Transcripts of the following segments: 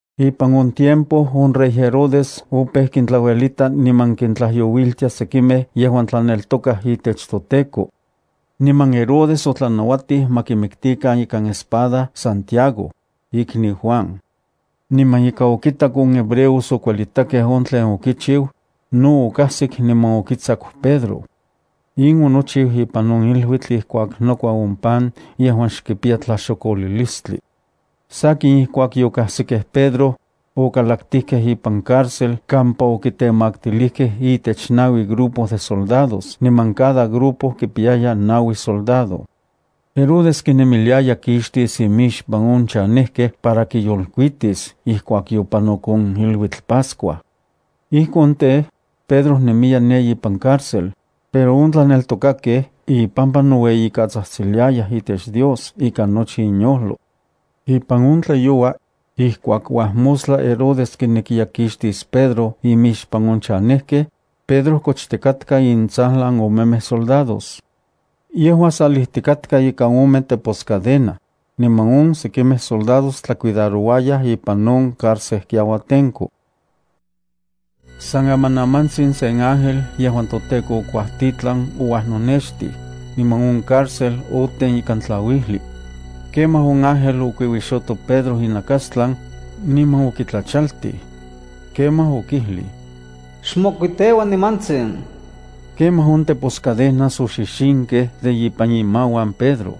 Ipan in tiempo on rey Herodes opeu kintlauelita niman kintlajyouiltia sekimej yejuan tlaneltokaj itech toTEKO. Niman Herodes otlanauatij ma kimiktikan ikan espada Santiago, ikniu Juan. Niman ika okitak on hebreos okuelitakej on tlen okichiu, no okajsik niman okitsaku Pedro. In onochiu ipan on iluitl ijkuak nokua on pan yejuan xkipiya tlaxokolilistli. Sakin ijkuak yokajsikej Pedro, okalaktijkej ipan cárcel kampa okitemaktilijkej itech naui grupo de soldados niman cada grupo kipiyaya naui soldado. Herodes kinemiliaya kixtis inmixpan on chanejkej para kiyolkuitis ijkuak yopanok on iluitl Pascua. Ijkon tej, Pedro nemiya ne ipan cárcel, pero on tlaneltokakej ipampa noueyikatsajtsiliayaj itech Dios ikan nochi inyojlo. Ipan on tlayoua, ijkuak uajmostla Herodes kinekiya kixtis Pedro inmixpan on chanejkej, Pedro kochtikatka intsajlan omemej soldados. Yejua salijtikatka ikan ome teposcadena, niman on oksekimej soldados tlacuidarouayaj ipan on carcejkiauatenko. San amanamantsin sen ángel yejuan toTEKO okuajtitlan ouajnonextij, niman on cárcel oten ikan tlauijli. Kemaj on ángel okuiuixoto Pedro inakastlan, niman okitlachaltij. Kemaj okijlij: —Xmokuiteua nimantsin. Kemaj on teposcadenas oxixinkej de ipan imauan Pedro.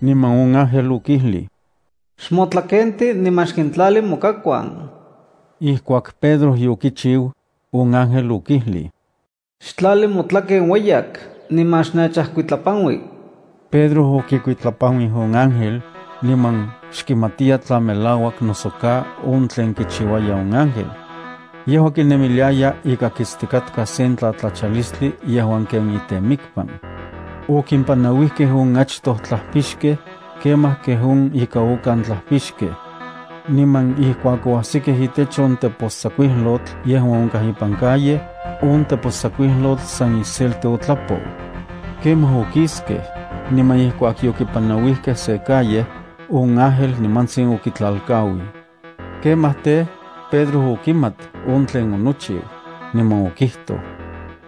Niman on ángel okijlij: —Xmotlakenti niman xkintlali mokakuan. Ijkuak Pedro yokichiu, on ángel okijlij: —Xtlali motlaken ueyak niman xnechajkuitlapanui. Pedro okikuitlapanuij on ángel, niman xkimatiya tla melauak noso ka on tlen kichiuaya on ángel. Yejua kinemiliaya ika kitstikatka sen tlatlachalistli yejuan ken itemikpan. Okimpanauijkej on achtoj tlajpixkej, kemaj kej on ika okan tlajpixkej. Niman ijkuak oajsikej itech on tepostsakuijlotl yejuan onkaj ipan calle, on tepostsakuijlotl san iselti otlapou. Kemaj okiskej, niman ijkuak yokipanauijkej se calle, on ángel nimantsin okitlalkauij. Kemaj tej, Pedro okimat on tlen onochiu, niman okijtoj: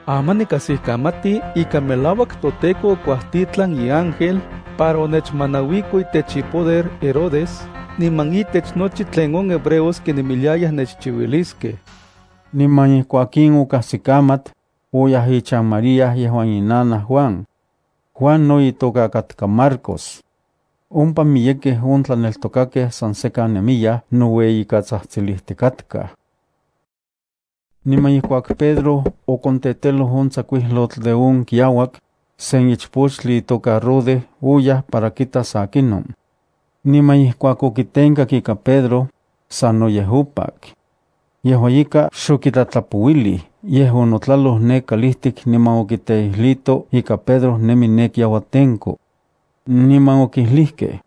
—Aman nikajsikamati ika melauak toTEKO okuajtitlan iángel para onechmanauiko itech ipoder Herodes niman itech nochi tlen on hebreos kinemiliayaj nechchiuiliskej. Niman ijkuak in okajsikamat, oyaj ichan María yejuan inanaj Juan. (Juan no itoka katka Marcos.) Ompa miyekej on tlaneltokakej san sekan nemiyaj noueyikatsajtsilijtikatkaj. Niman ijkuak Pedro okonteteloj on tsakuijlotl de on kiauak, se ichpochtli itoka Rode oyaj para kitas akinon. Niman ijkuak okitenkak ika Pedro, sanoyej opak. Yejua ika xokitlatlapouilij, yej onotlaloj ne kalijtik niman okiteijlito ika Pedro nemi ne kiauatenko. Niman okijlijkej: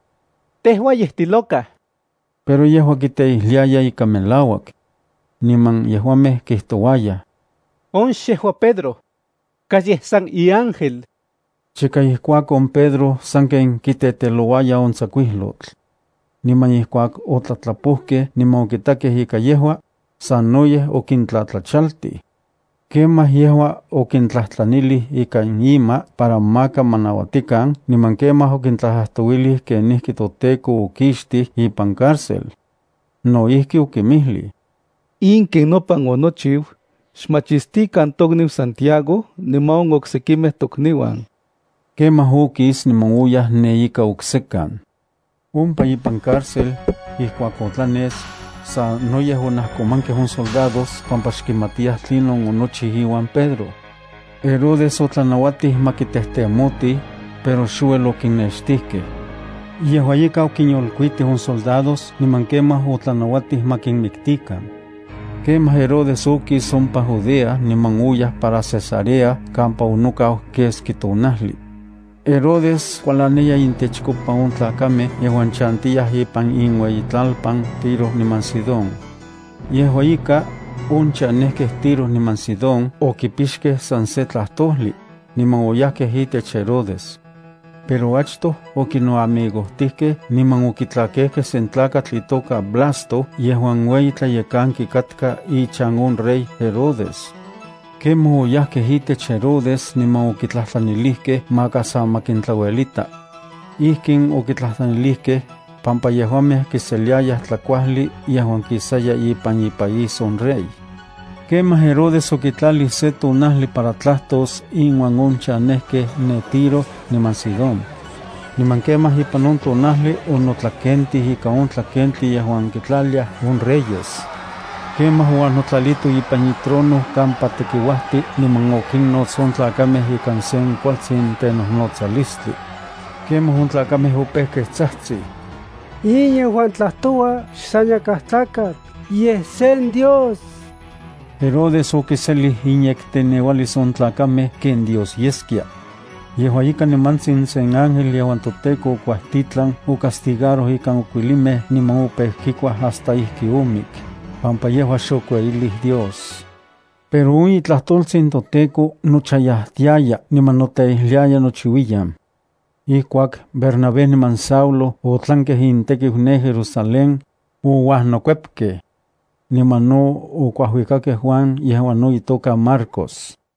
—¡Tejua yej tiloca! Pero yejua kiteijliaya ika melauak. Niman yejuamej kijtouayaj: —On xejua Pedro. Kas yej san iángel. Chika ijkuakon Pedro sanken kitetelouaya on tsakuijlotl. Niman ijkuak otlatlapojkej niman okitakej ika yejua, sanoyej okintlatlachaltij. Kemaj yejua okintlajtlanilij ikan ima para maka ma nauatikan niman kemaj okintlajtlajtouilij kenijki toTEKO okixtij ipan cárcel. No ijki okinmijlij: —In ken nopan onochiu xkinmachistikan tokniu Santiago niman on oksekimej tokniuan. Kemaj okis niman oyaj ne ika oksekan. Ompa ipan carcel, ijkuak otlanes, sanoyej onajkomankej on soldados pampa xkimatiyaj tlinon onochiu iuan Pedro. Herodes otlanauatij ma kitejtemotij, pero xouel okinextijkej. Yejua ika okinyolkuitij on soldados niman kemaj otlanauatij ma kinmiktikan. Kemaj Herodes okis ompa Judea niman oyaj para Cesarea kampa onokau keski tonajli. Herodes kualaniya intechkopa on tlakamej yejuan chantiyaj ipan inuejtlalpan Tiro niman Sidón. Yejua ika, on chanejkej Tiro niman Sidón okipixkej san se tlajtojli, niman oyajkej itech Herodes. Pero achtoj okinoamigojtijkej niman okitlakejkej sen tlakatl itoka Blasto yejuan ueyi tlayekanki katka ichan on rey Herodes. Kemaj oyajkej itech Herodes niman okitlajtlanilijkej maka sa ma kintlauelita. Ijkin okitlajtlanilijkej, pampa yejuamej kiseliayaj tlakuajli yejuan kisaya ipan ipaís on rey. Kemaj Herodes okitlalij se tonajli para tlajtos inuan on chanejkej ne Tiro niman Sidón. Niman kemaj ipan on tonajli onotlakentij ika on tlakentli yejuan kintlaliaj on reyes. Kemaj ouajnotlalito ipan itrono kampa tekiuajti niman okinnots on tlakamej ikan se kualtsin tenojnotsalistli. Kemaj on tlakamej opejkej tsajtsij: —¡In yejuan tlajtoua xsan yakaj tlakatl, yej sen dios! Herodes okiselij inyekteneualis on tlakamej ken Dios yeskia. Yejua ika, nimantsin se ángel yejuan toTEKO okuajtitlan ocastigaroj ikan okuilimej niman opeu kikuaj hasta ijki omik, pampa yejua xokueyilij Dios. Pero on itlajtoltsin toTEKO nochayajtiaya niman noteijliaya nochiuiyan. Ijkuak Bernabé niman Saulo otlankej intekiu ne Jerusalén, ouajnokuepkej. Niman no okuajuikakej Juan yejuan no itoka Marcos.